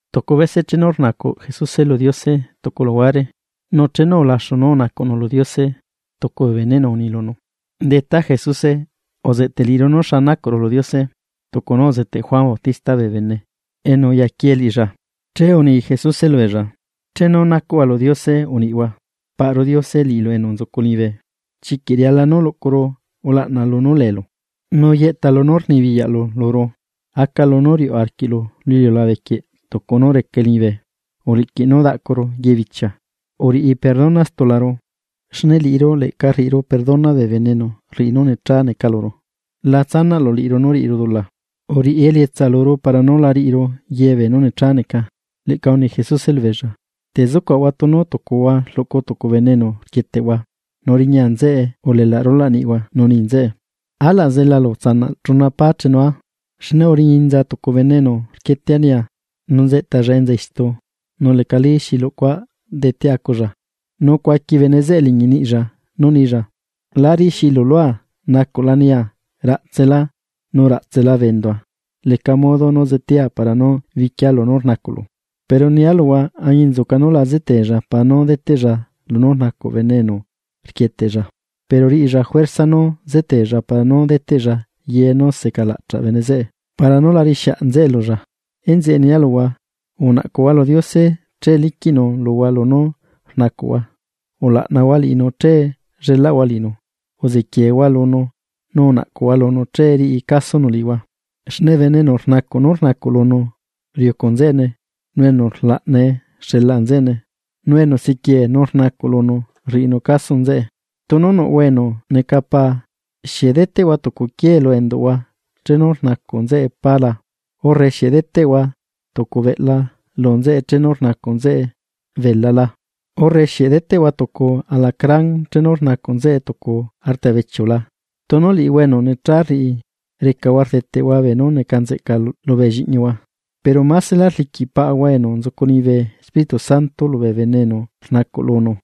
Tucu bese chenu rnacuꞌ Jesuse lu Diose tucu luhuare, nu chenu ulaxu nú unacuꞌnu lu Diose, tucu bee beneꞌnu uni lunu: ―Detá Jesuse, uzeꞌteꞌ liꞌiru xa nacuꞌru lu Diose, tucu nú uzeteꞌ Juan Bautista bee bene, enu uyaquie liꞌilla. Che uni Jesuse lubeella: ―Chenu nacuꞌhua lu Diose uniꞌhua: Paꞌru Diose, liꞌilu enu nzucu liñibe, chiquiꞌ riala nú luꞌcuru ulaꞌna lunú leelu. Nu yeꞌta lunú rnibiyaꞌlu luru. Aca lunú riuꞌ arquiꞌlu lu iliulabe quieꞌ tucu nú reca liñibe. Uliꞌquiꞌ nú daꞌcuru ye bichia. Uriꞌi perdona stularu, xne liꞌiru leꞌca rriꞌiru perdona bee bene enu rriꞌi nú necha neca luru. La tsanaꞌlu liꞌiru nú riꞌiru dula, uriꞌi elietsa luru para nú la riꞌiru ye beenú necha neca. Leꞌca uni Jesuse lubeella: ―Te zucuaꞌahua tunu tucuhua rluꞌcu tucu bene enu rquieteꞌhua, nu riña nzeꞌe ulelaꞌ rulaꞌ niꞌhua nu ni nzeꞌe: “Alaꞌ zelalu utsanaꞌ chuna pá chenua, xne uriña inza tucu bene enu rquietea nia, nu nzeꞌtalla enza istu nu lecalí xi lucua detea aculla.” Nu cuaqui bene zeꞌe liñi niꞌlla nú nilla: “La riꞌixiꞌilu lua nacuꞌla nia, raꞌtselá nu raꞌtsela bee endua leca modo nú zetea para nú biquia lunú rnacuꞌlu.” Pero nia luhua, añinzuca nú la zeteella para nú deteꞌlla lunú rnacuꞌ bene enu rquieteꞌlla, pero riꞌilla juerza nú zeteella para nú deteꞌlla ye nú secalaꞌchaꞌ bene zeꞌe para nú la riꞌixiaꞌ nzeꞌe lulla. Enzeꞌe nia luhua: Unaꞌcuhua lu Diose che liquiꞌnu luhua lunú rnacuꞌhua. Ulaꞌnahua liꞌinu, che llelaꞌhua liꞌinu. Uziquieehua lunu nu unaꞌcuhua lunu che riꞌi casonu liꞌihua. Xne bene enu rnacuꞌ nú rnacuꞌ lunu riucu nzeꞌene, nu enu rlaꞌnae xelaꞌ nzeꞌene, nu enu siquiee nu rnacuꞌ lunu rriꞌinu caso nzeꞌe. ’Tunu nuꞌhua enu neca paa, ¿Xieꞌ deteꞌhua tucu quiee lu enduꞌhua chenu rnacuꞌ nzeꞌe pá la? ¿Urre xieꞌ deteꞌhua tucu beꞌla lu nzeꞌe chenu rnacuꞌ nzeꞌe beela la? ¿Urre xieꞌ deteꞌhua tucu alacrán chenu rnacuꞌ nzeꞌe tucu artabechiu la? Tunu liꞌihua enu necha rriꞌi, recahua rdeteꞌhua beenú neca nzeꞌca lubee lliꞌñihua, ¡Pero máselá rliquiꞌ Paꞌahua enu nzucu liñibe Espíritu Santo lubee bene enu rnacuꞌ lunu!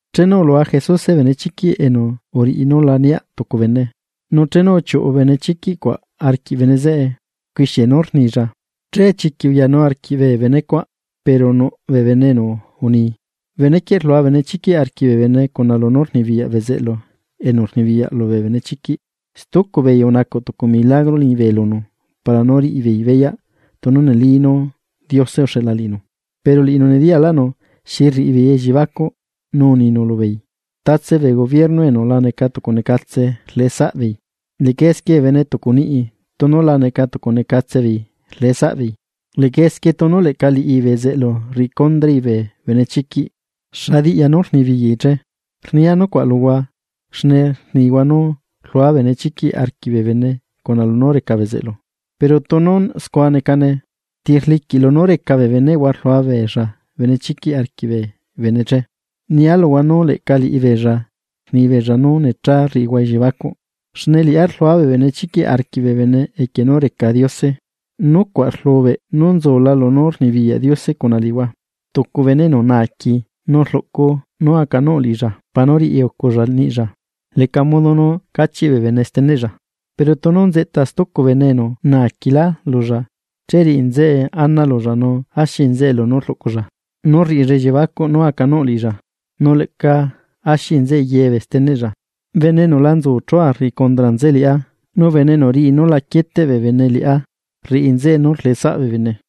Chenu ulua Jesuse benechiquiꞌ enu uriꞌi nú lá niaꞌ tucu bene, nu chenu uchiuꞌu benechiquiꞌ cuaꞌ arquiꞌ bene zeꞌe, uquixie nú rnilla. Che chiquiꞌ uyanu arquiꞌ bee bene nucuaꞌ, pero nuꞌ bee bene enu uni: ―Benequieꞌ rlua benechiquiꞌ arquiꞌ bee bene cuna lunú rnibiyaꞌ bezeꞌlu enu rnibiyaꞌ lubee benechiquiꞌ. Stucu beei unacuꞌ tucu milagro liñibe lunu para nú riꞌi beei beyaꞌ tunu neli nú Diose uxeꞌla liꞌinu. Pero liꞌinu nediyaꞌlaꞌnu xi rriꞌi beei elliebacuꞌ nu uninu lubeei: ―Tatse bee gobierno enu la neca tucu necatse rleꞌ saꞌbeei, leꞌca esquie bee bene tucu niꞌi tunu la neca tucu necatse beei rleꞌe saꞌbeei. Leꞌca esquie tunu leꞌca liꞌi bezeꞌlu riꞌi condrai bee benechiquiꞌ, ¿xa diꞌya nú rnibiyaꞌi che? Rnia nucuaꞌ luhua, xne rnihua nú rluaa benechiquiꞌ arquiꞌ bee bene cuna lunú reca bezeꞌlu. Pero tunu scua necane, ¿ti rliquiꞌ lunú reca bee beneꞌhua rlua beella benechiquiꞌ arquiꞌ bee bene che? Nia luhua nú leꞌca liꞌibeella rni beella nú necha rriꞌihua elliebacuꞌ. Xne liꞌá rlua bee benechiquiꞌ arquiꞌ bee bene equie nú reca Diose, nucuaꞌ rlubeꞌ nú nzula lunú rnibiyaꞌ Diose cuna liꞌihua. ’Tucu bene enu naaqui nu rluꞌculla nú acanuꞌ liꞌilla para nú riꞌiuculla niꞌlla, leca modo nú cachiꞌ bee bene steneꞌlla. Pero tunu nzeꞌta stucu bene enu naaquilá lulla, che riꞌi nzeꞌe ana lulla nu axi nzeꞌe lunú rluꞌculla, nú rriꞌilla elliebacuꞌ nú acanuꞌ liꞌilla, nu leꞌca axi nzeꞌe ye bee steneꞌlla. ’Bene enu la nzu chua rriꞌi condra nzeꞌe liꞌá, nu bene enu riꞌi nú la quieteꞌ bee bene liꞌá, rriꞌi nzeꞌe nú rleꞌe saꞌ bee bene.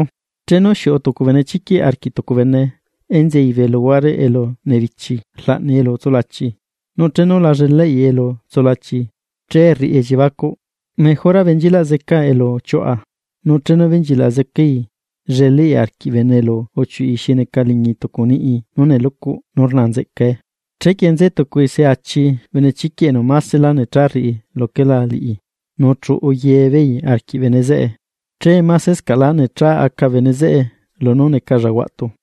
’Chenu xiuꞌu tucu benechiquiꞌ arquiꞌ tucu bene, enzei bee luhuare elu nebichi rlaꞌnai elu tsulachii. Nu chenu la llelaꞌi elu tsulachii, che rriꞌi elliebacuꞌ: “Mejora benchilaꞌ zecaa elu uchiuꞌa.” Nu chenu benchilaꞌ zecai, llelaꞌi arquiꞌ bene elu uchiuꞌi xi neca liñi tucu niꞌi nú nelucuꞌ nu rnaa nzeꞌcae. Chequie nze tucui se achi benechiquiꞌ enu másela necha rriꞌi luquela liꞌi, nu chuꞌu ye beei arquiꞌ bene zeꞌe. Che masescaꞌlá necha aca bene zeꞌe lunú necalla huaꞌtu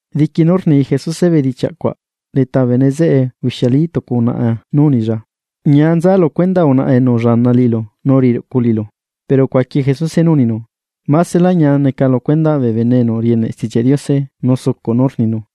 Diqui nú rni Jesuse bedichiaꞌ cuaꞌ, leta bee bene zeꞌe ubixialí tucu unaꞌa nu unilla: ―¡Ñia nza lu cuendaꞌ unaꞌa enu ullaana liꞌilu nu uriꞌi ruꞌcu liꞌilu! Pero ucuaqui Jesuse nú uninu: ―¡Maselá ñia neca lu cuendaꞌ bee bene enu rieneꞌ Stichiaꞌ Diose nu sucuꞌ nú rninu!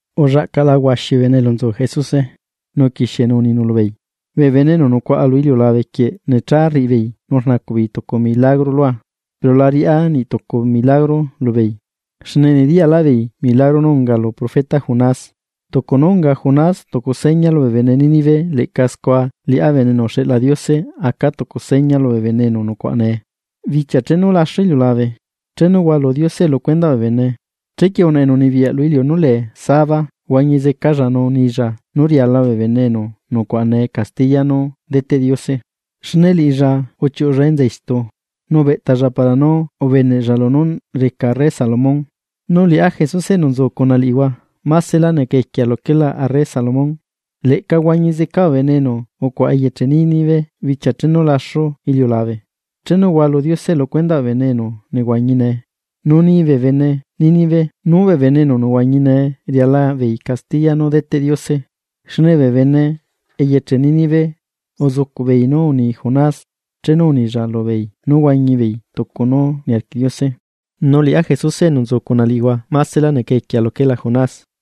Ullaꞌcaꞌla huaxi bee bene elu nzu Jesuse, nu uquixienu uninu lubeei: ―Bee bene enu nucuaꞌa lu iliulabe quieꞌ necha rriꞌi beei nu rnacuꞌ beei tucu milagro lua, pero la riaꞌa niꞌtucu milagro lubeei, xne nediyaꞌlaꞌbeei milagro nú unga lu profeta Jonás. Tucu nú unga Jonás tucu seña lubee bene Nínive, leꞌca scua liꞌá Bene enu uxeꞌla Diose aca tucu seña lubee bene enu nucuaꞌa nee. Bichia chenu laxu iliulabe, chenu hualu Diose lu cuendaꞌ bee bene, chequie unaꞌa enu unibiyaꞌ lu iliu nú lee sabá huañi zecalla nu nilla nú riala bee bene enu nucuaꞌa nee castiya nú deteꞌ Diose. Xne liꞌilla uchiuꞌulla enza istu, nu ubeꞌtalla para nú ubeneꞌlla lunú reca arre Salomón. Nu liꞌá Jesuse enu nzu cuna liꞌihua, másela neca equia luquela arre Salomón. Leꞌca huañi zeca bee bene enu ucuaꞌa eyeche Nínive bichia chenu laxu iliulabe, chenu hualu Diose lu cuendaꞌ bee bene enu nehuañi nee, nu ni bee bene Nínive nú bee bene enu nehuañi nee riala beei castiya nú deteꞌ Diose. Xne bee bene eyeche Nínive uzucuꞌbeei nú uni Jonás chenu unilla lubeei nú huañi beei tucu nú niarquiꞌ Diose. Nu liꞌá Jesuse enu nzu cuna liꞌihua másela neca equiea luquela Jonás.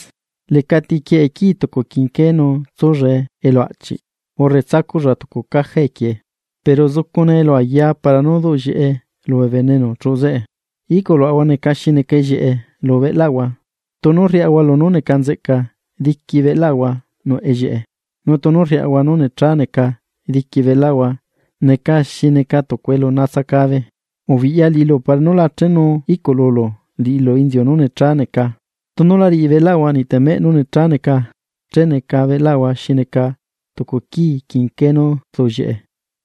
’Lecati quieꞌe quii tucu quinqué nu tsullae elu aꞌchiꞌ, urre tsacuꞌlla tucu caja equiee. Pero zucune elu ayaa para nú duꞌ llieꞌe lubee bene enu chuꞌu zeꞌe. Iꞌculuaꞌahua neca xi neca ellieꞌe lu cuerpoꞌahua, tunu rriaꞌahua lunú neca nzeꞌca diqui cuerpoꞌahua nuꞌ ellieꞌe. Nu tunu rriꞌahua nú necha neca, diqui cuerpoꞌahua neca xi neca tucu elu natsacabe. Ubiꞌya liꞌilu para nú la chenu iꞌcululu liꞌilu inziu nú necha neca. Tunu la riꞌi cuerpoꞌahua niꞌ temeꞌ nú necha neca, che neca cuerpoꞌahua xi neca tucu quiꞌ quinqué nú rduꞌllieꞌe.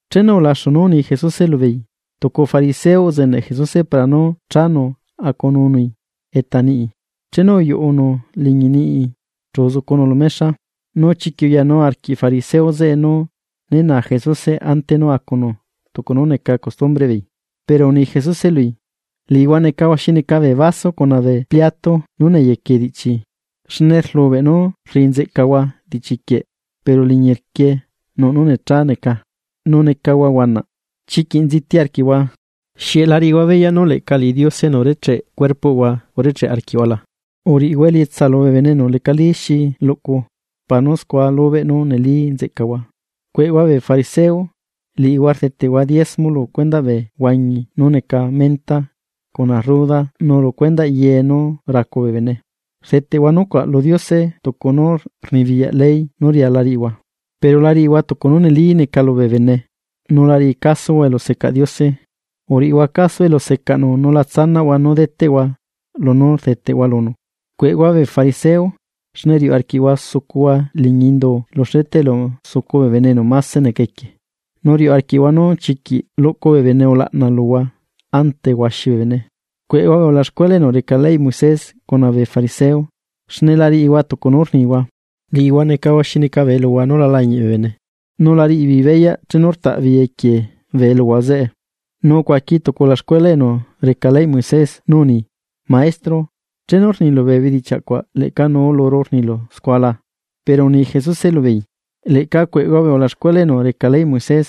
Chenu ulaxu nú uni Jesuse lubeei, tucu fariseo uzeneꞌ Jesuse para nú chanu acununui eta niꞌi. Chenu uyuꞌunu liñi niꞌi chu uzucunu lu mexa. Nu chiquiꞌ uyanu arquiꞌ fariseo zeꞌe nú ne naa Jesuse ante nú acunu tucu nú neca costumbreꞌ beei. Pero uni Jesuse lui: ―Liꞌihua necahua xi neca bee vaso cuna bee pliato nú neyequie diꞌchi, xne rlubeꞌ nú neca nzeꞌcahua diꞌchiquie pero liñirquie nuꞌ nú necha neca nu necahua huanaꞌ. ¡Chiquiꞌ nziti arquiꞌhua! ¿Xieꞌ la riꞌihua beyaꞌ nú leꞌca liꞌi Diose enu urecheꞌ beꞌlaꞌhua urecheꞌ arquiꞌhua la? Uriꞌihua elietsa lubee bene enu lecalí xi luꞌcu, para nú scua lubeꞌ nú neli nzeꞌcahua. ’¡Cueꞌhua bee fariseo!, liꞌihua rdeteꞌhua diezmo bee huañi nú neca menta, cuna rruda nu ye nú racu bee bene. Rdeteꞌhua nucuaꞌ lu Diose tucu nú rnibiyaꞌ ley nú riala riꞌihua, pero la riꞌihua tucu nú neli neca lubee bene, nu la riꞌi casohua elusecaꞌ Diose. Uriꞌihua caso elu secaꞌnu nu la tsanaꞌhua nú deteꞌhua lunú rdeteꞌhua lunu. ’¡Cueꞌhua bee fariseo!, xne riuꞌ arquiꞌhua sucuhua liñi indu lu xleta elu sucu bee bene enu mase neca equie, nu riuꞌ arquiꞌhua nú chiquiꞌ luꞌcu bee bene ulaꞌna luhua ante huaxi bee bene. ’¡Cueꞌhua bee ulaxcuela enu reca leyꞌ Moisés cuna bee fariseo, xne la riꞌihua tucu nú rnihua! Liꞌihua necahua xi neca bee eluhua nú la lañiꞌ bee bene, nu la riꞌi beei beyaꞌ chenu rtaꞌ beei equie bee eluhua zeꞌe. Nu ucuaqui tucu ulaxcuela enu reca leyꞌ Moisés nú uni: ―Maestro, chenu rnilu bee bedichiaꞌ cuaꞌ leꞌca nuu luru rnilu scua la. Pero uni Jesuse lubeei: ―¡Leꞌca cueꞌhua bee ulaxcuela enu reca leyꞌ Moisés!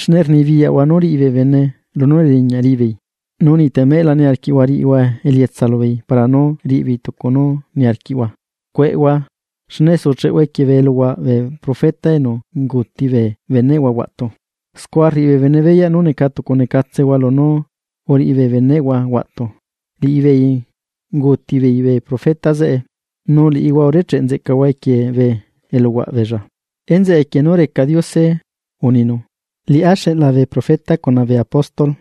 Xne rnibiyaꞌhua nú riꞌi bee bene lunú neriñaꞌ riꞌi beei, nu niꞌ temeꞌ la niarquiꞌhua riꞌihua elietsa lubeei para nú riꞌi beei tucu nú niarquiꞌhua. ’¡Cueꞌhua! Xne sucheꞌhua equie bee eluhuaꞌ bee profeta enu unguuti bee beneꞌhua huaꞌtu. Scua rriꞌi bee bene beyaꞌ nú neca tucu necatsehua lunú uriꞌi bee beneꞌhua huaꞌtu. Liꞌibeei unguuti beei bee profeta zeꞌe, nu liꞌihua urecheꞌ nzeꞌcahua equie bee eluhuaꞌ beella. ’Enzeꞌe equie nú reca Diose uninu: “Liꞌá xeꞌla bee profeta cuna bee apóstoles,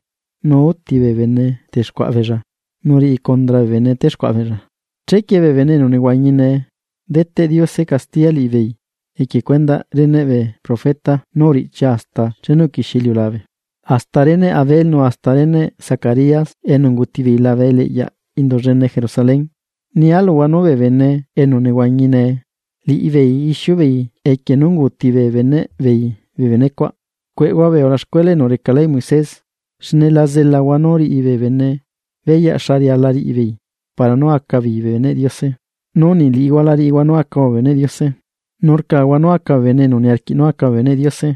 nu úti bee bene texcuaꞌa beella, nu riꞌi condra bee bene téxcuaꞌa beella.” Chequie bee bene enu nehuañi nee, deteꞌ Diose castiya liꞌibeei equie cuendaꞌ reneꞌ bee profeta nú uriꞌchia hasta chenu uquixie iliulabe. Hasta reneꞌ Abel nu hasta reneꞌ Zacarías enu unguuti beei labe eliꞌyaꞌ indu llene Jerusalén. Nia luhua nú bee bene enu nehuañi nee, liꞌibeei ixiu beei equie nú unguuti bee beneꞌ beei bee benecuaꞌ. ’¡Cueꞌhua bee ulaxcuela enu reca leyꞌ Moises!, xne la zelahua nú riꞌi bee bene beyaꞌ xa riala riꞌi beei para nú aca beei bee beneꞌ Diose, nu niꞌ liꞌihua la riꞌihua nú acahua bee beneꞌ Diose, nu rcahua nú aca bee bene enu niarquiꞌ nú aca bee beneꞌ Diose.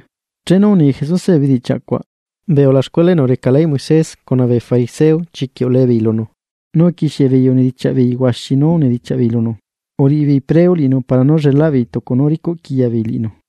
Chenu uni Jesuse bee bedichiaꞌ cuaꞌ, bee ulaxcuela enu reca leyꞌ Moisés cuna bee fariseo chiquiꞌ ulee beei lunu, nu uquixie beei unidichiaꞌ beei huaxi nú unidichiaꞌ beei lunu. Uriꞌi beei preo liꞌinu para nú llelaꞌ beei tucu nú ricuꞌquiya beei liꞌinu.